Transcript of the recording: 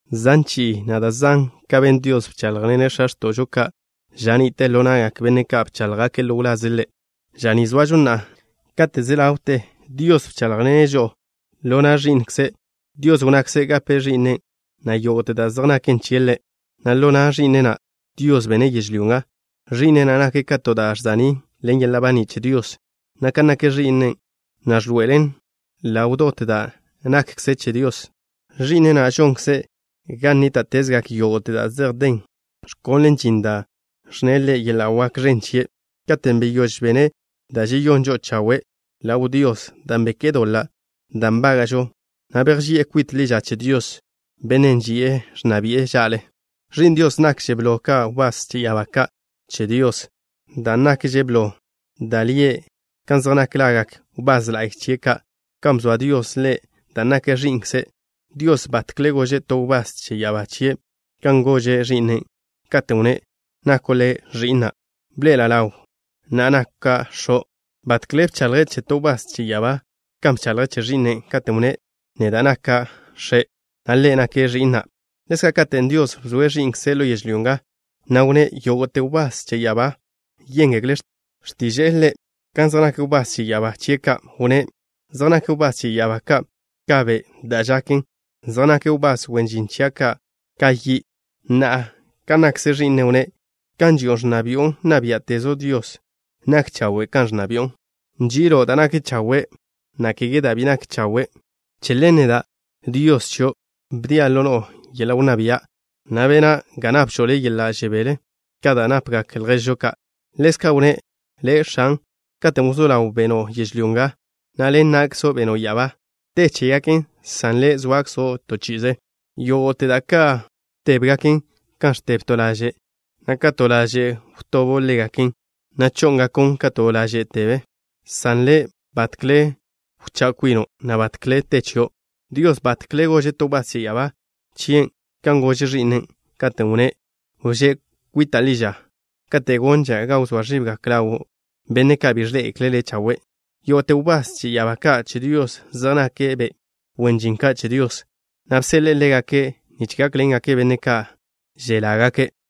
Zan chi'i, na' da' zan kan ben Dios, bcháḻjḻene' x̱a x̱to'žo ka' ža ni'te ḻo na'gak benne' ka' bcháḻjgake' ḻo wlaze' Ḻe'. Ža ni zoažo na'a, kate' ze ḻawte, Dios bcháḻjḻene' žo'o ḻo na' Ẕi'nkze'. Dios wnnakze' gape Ẕi'ne' na' yógo'te da' zej naken chie' Ḻe', na' ḻo na' Ẕi'ne' na', Dios bene' yežlyó nga. Ẕi'ne' na' nake' ka to da' žsa'ní' ḻen yeḻa' baní' che Dios, na' kan nak Ẕi'ne' na' ẕḻoe'elen ḻaw dot da' nakkze Dios. Ẕi'ne' na' žonkze' ga nníta'tezgak yógo'te da' zej den, ẕkonle' žin da' ẕnne' ḻen yeḻa' wak ẕen chie'. Katen' beyóž bene' da' žeyón žo'o chawe' ḻaw Dios dan' beké'e doḻa' da' nbága'žo, na' bejži'e kwit ḻi ža che Dios, Bennen' ži'e ẕnna bi'e ža'le. Ẕi'n Dios nakže' blo ka wbás che ya'abá ka' che Dios, dan' nakže blo da' lie' ka zej nak lagak wbás la'y chie' ka', kan bzoa Dios le' dan' nake' Ẕi'nkze'. Dios batkle gože' to wbás che ya'abá chie' kan gože' Ẕi'ne', katen' wnné': Nako' Le' Ẕi'na'. Bḻoe'ela' ḻaw na'a naka' X̱o'. Batkle bchaḻje' che to wbás che ya'abá kan bchaḻje' che Ẕi'ne', katen' wnné': Neda' naka' X̱e', na' Ḻe' nake' Ẕi'na'. Ḻezka', katen' Dios bzoe' Ẕi'nkzen' ḻo yežlyó nga, na' wnné': Yógo'te wbás che ya'abá yéngekle' x̱tiža' Ḻe'. Kan zej nak wbás che ya'abá chie' ka', wnné': Zej nak wbás che ya'abá ka' ka be' da' žaken. Zej nak wbás wen žin chia' ka' ka yi'. Na'a, kan nakkze Ẕi'ne', wnné': Gan ži'o ẕnna bi'o, nna biá'tezo', Dios. Nak chawe' kan ẕnna bi'o. Nži'ilo' da' nak chawe', na' kege da' bi nak chawe'. Che ḻen neda', Dios chio', bdia' ḻo no'o yeḻa' wnná bia', na' bena' ga napžo' Le' yeḻa' žebél ka da' napgak lježo' ka'. Ḻezka' wnné': Le', X̱an, katen' wzó ḻaw, beno' yežlyó nga, na' ḻen na'kzo' beno' ya'abá. Te chégaken, san Le', zoakzo' to chi'ize. Yógo'te da' ka' tébgaken kan ẕteb to laže', na' ka to laže' wtobo' ḻégaken, na' chó'ngakon' ka to laže' teb, san Le', batkle wchá' kwino' na' batkle te chio'. Dios batkle gože' to wbás che ya'abá chie' kan gože' Ẕi'ne', katen' wnné': Wžé' kwita' ḻi ža kate' gonža' ga wzóa ẕibgak ḻawo' benne' ka' bi ẕḻé'egekle' Le' chawe'. Yógo'te wbás che ya'abá ka' che Dios zej nake' be' wen žin ka' che Dios, na' bseḻe'e ḻégake' nich gákḻengake' benne' ka' želágake'.